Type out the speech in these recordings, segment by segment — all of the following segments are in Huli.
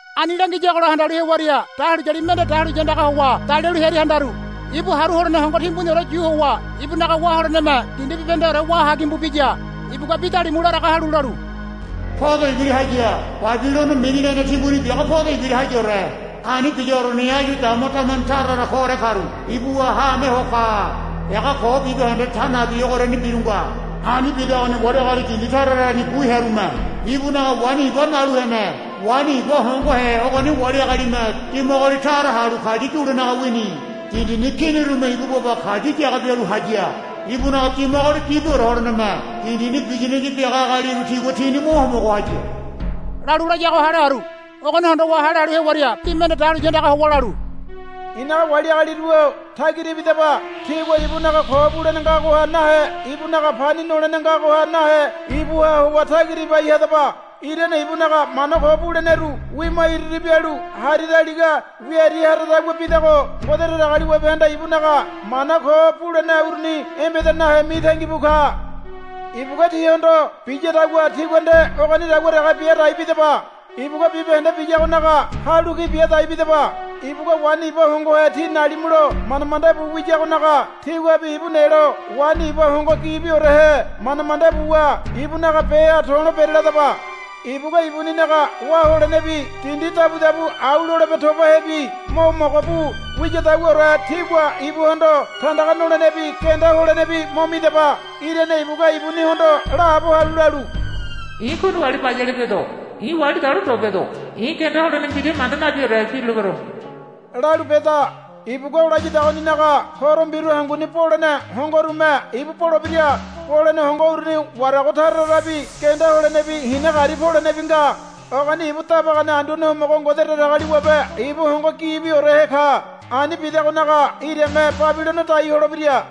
Ani langiyagola handalu hewaria dahuliyali mende dahuliya andagaha howa dalialu hearia handaru. Ibu haru holene hongo timbuniore yu howa ibunaga wá holeneme dindi bibahendeore wá hagimbu biya. Ibugua bi dalimu laraga halu lalu, Podo ibira haya. Babilono mini lene timbuni biago podo ibira hayaore. Ani biyagoriani áyu dama damene tara tara koore karu ibuha haame ho ka. Ega ko bibahende ta nabi ogoriani biru nga. Ani bidagoni wali agali dindi tara tarani bu hearume ibunaga waini iba nalu hene. Waini iba hongohe ogoni wali agalime dimagoli tara halu kayu yulenaga wini. Dindini kinirume ibu baba kayu yaga bialu haya. Ibunaga dimagoli gibiore holeneme dindini biyanaya biaga agaliru tigua tini mo homogo haya, lalu layago hale haru. Ogoni hondowa hale halu hewaria bi mende dahuliya andaga howa lalu, I̱naga wali agaliru-o tagira ibidaba. Tígua ibunaga ko bulene ngagoha nahe ibunaga pani nolene ngagoha nahe ibuha howa tagira ibai hadaba. Irane ibunaga mana ko buleneru wima iri iri bialu hari daliga wia iri haradagua bidago Ngode Datagaliwabehanda ibunaga mana ko bulene uruni embeda nahe mitangi bu ka. Ibugua tíhondo biyadagua tígua nde ogonidagua dege bia dai bidaba. Ibugua bibahende biyagonaga halu ki bia dai bidaba. Ibugua waini iba hongohe tí nalimulo manda manda bu wiyagonaga tíguabi ibu nelo waini iba hongo gibiorehe manda manda buwa ibunaga beha to̱lo bereladaba. Ibugua ibuninaga wá holenebi dindi dabudabu au lolebe tobahebi mo mogo bu wiyadaguaore tígua ibuhondo tandaga nolenebi genda holenebi mo midaba. Irane ibugua ibunihondo laabo halu lalu, I̱ kuini wali bayale bedo. I̱ wali dalo ndo bedo. I̱ genda holene mbira manda nabiore birulebero, lalu beda. Ibugua o layadagoninaga horo mbiru hanguni bolene hongoherume ibu bolebira. Bolene hongo uruni warago tara tarabi genda holenebi hina gari polenebi nga. Ogoni ibu dabagane Anduane Homogo Ngode Datagaliwabe ibu hongo gibiorehe ka. Ani bidagonaga irame Babilono dai holebira,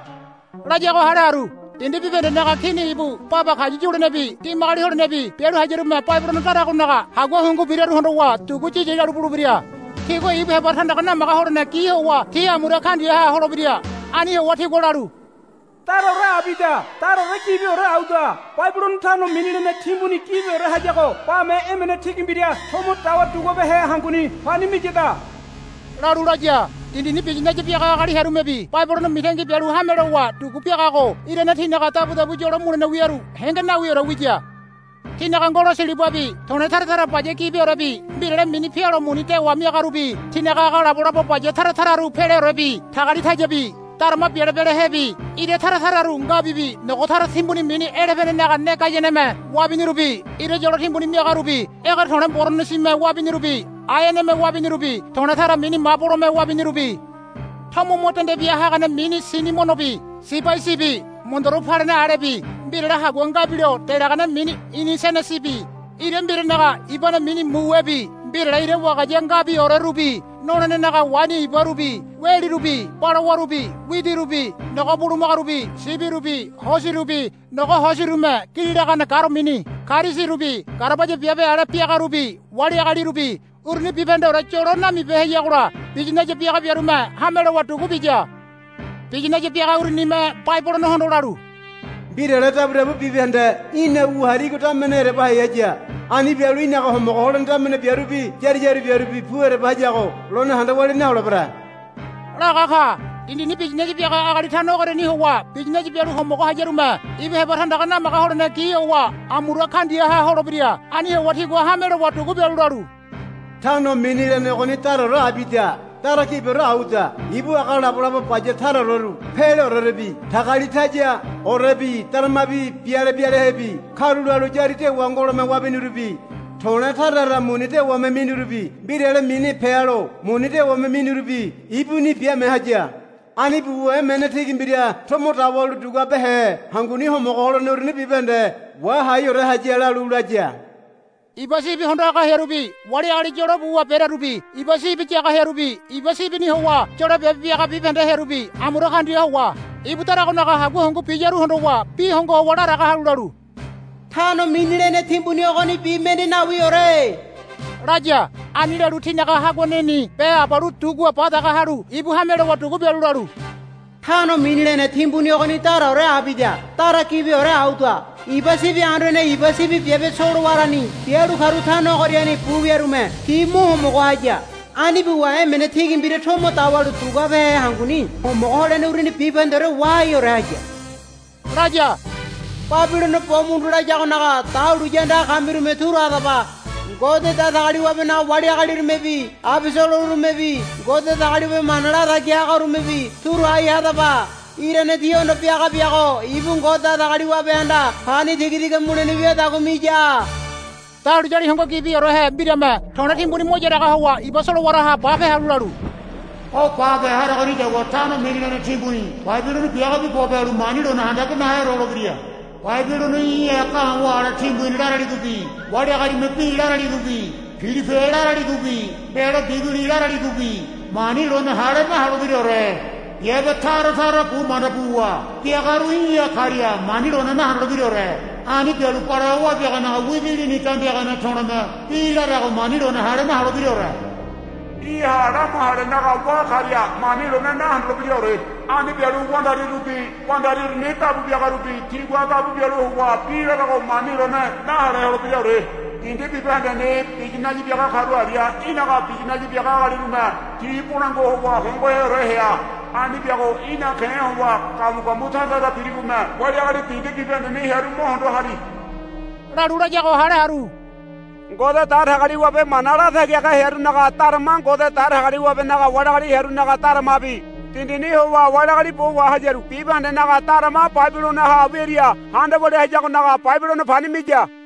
layago hale haru. Dindi bibahendenaga kini ibu baba kayu yulenebi dimagoli holenebi bialu hayarume Babilono daragonaga hagua hungu biraru hondowa dugu yiyi lalu bulebira. Tigua ibu heba tandaga namaga holene gi howa ti amura kaundiaha holebira. Ani howa tigua lalu, Daraore abida dara gibiore auda. Babilono tano mini lene timbuni gibiore hayago bame emene tigi mbira tomo dawa duguabehe hanguni pani miyada, lalu laga. Dindini biyinaya biaga agali hearumebi Babilono mitangi bialu hame lowa dugu biagago irane tinaga dabudabu yolo mulene wiaru henge nawiore wiya. Tinaga ngolo silibabi to̱le̱ tara tara baya gibiorebi mbirale mini pealo muni dewa miagarubi tinaga aga labolabo baya tara tararu peleorebi tagalitayabi darama biale bialehebi ira tara tararu ngabibi nogo tara timbuni mini elebeninaga ne gayaneme wabinirubi ira yolo timbuni miagarubi ege to̱le̱ boronosime wabinirubi aeaneme wabinirubi to̱le̱ tara mini mabolome wabinirubi tomo mo dende bia hagane mini sinimonobi sibaisibi mondoro palena alebi mbirale hagua ngabilo delagane mini inisenesibi ira mbiranaga ibane mini muwebi mbirale ira wagaya ngabiorerubi nolenenaga waini ibarubi welirubi balawarubi widirubi nogo bulumagarubi sibirubi hosirubi nogo hosirume gili lagane garo mini karisirubi garabaya biabe ale biagarubi wali agalirubi uruni bibahendeore yolo namibeheyagola biyinaya biaga biarume hame lowa dugu biya. Biyinaya biaga urunime Babilonohondo lalu, Mbirale dabudabu bibahende í̠na wua harigo damene ereba hai haya. Ani bialu í̠naga homogo holene damene biarubi yári yári biarubi pu ereba hayago lone handa walia naholebere, laga ka. Dindini biyinaya biaga agali tano ogoriani howa biyinaya bialu homogo hayarume ibu heba tandaga namaga holene gi howa amura kaundiaha holebira. Ani howa tigua hame lowa dugu bialu lalu, Tano mini lene ogoni daraore abida dara gibiore auda. Ibu aga labolabo baya tara tararu peleorebi tagalitayaorebi darama biale bialehebi karulalu yári dewa ngolome wabinirubi to̱le̱ tara tara muni dewame minirubi mbirale mini pealo muni dewame minirubi ibunini biame haya. Ani buwa emene tigi mbira tomo dawalu duguabehe hanguni homogo holene uruni bibahende wahaiore haya, lalu laya. Iba sibi hondo haga hearubi wali agali yolo buwa berearubi iba sibi yaga hearubi iba sibini howa yolo biabe biaga bibahende hearubi amura kaundia howa ibu daragonaga hagua hungu biyaru hondowa bi hongo howa laraga halu lalu, Tano mini lene timbuni ogonibi mende nawiore, laya. Ani lalu tinaga haguaneni be abalu dugua ba daga halu ibu hame lowa dugu bialu lalu, Tano mini lene timbuni ogoni daraore abida dara gibiore auda. Iba sibi anduane iba sibi biabe solowarani bialu karu tano ogoriani bu wiarume ti mo homogo haya. Ani buwa emene tigi mbira tomo dawalu duguabehe hanguni homogo holene uruni bibahendeore wahaiore haya, laya. Babilono bo mundu layagonaga dahuliya andaga kamirume turu hadaba. Ngode Datagaliwabenaga wali agalirumebi abosolorumebi Ngode Datagaliwabe mana latagi hagarumebi turu hai hadaba. Irane tíhondo biaga biago ibu Ngode Datagaliwabehanda pani tiga tiga mulene wiadagua miya. Dahuliyali hongo gibiheore mbirame to̱le̱ timbuni mo yaraga howa iba solowaraha bape halu lalu, O bape harogonidagua tano mini lene timbuni Babilono biagobi bope halu mani lone handabe naheore holebira. Babilono í̠ha ga̱wa̱ ale timbuni laraligobi wali agalime bi laraligobi pilipe laraligobi mbelo biguli laraligobi mani lone hale naholebiraore. Biabe tara tara bu manda buwa biagaru í̠ha karia mani lone nahondolebiraore. Ani bialu balawa wabiaganaga widi lini dambiagane to̱le̱me bi larago mani lone hale naholebiraore. Í̠ha lamu halenaga wá karia mani lone nahondolebiraore. Ani bialu wandarirubi wandari uruni dabu biagarubi tigua dabu bialu howa bi larago mani lone nahale holebiraore. Dindi bibahendeni biyinaya biaga karu aria í̠naga biyinaya biaga agalirume ti bolangua howa hongoheore hea. Ani biago í̠na ke̱ howa gamu gamu tara tara birigome wali agali dindi bibahendeni hearu mo hondo hari, lalu layago hale haru. Ngode Datagaliwabe mana latagi haga hearunaga darama Ngode Datagaliwabenaga wali agali hearunaga daramabi dindini howa wali agali bo wahayaru bibahendenaga darama Babilonoha wiaria handa walia hayagonaga Babilono pani miya.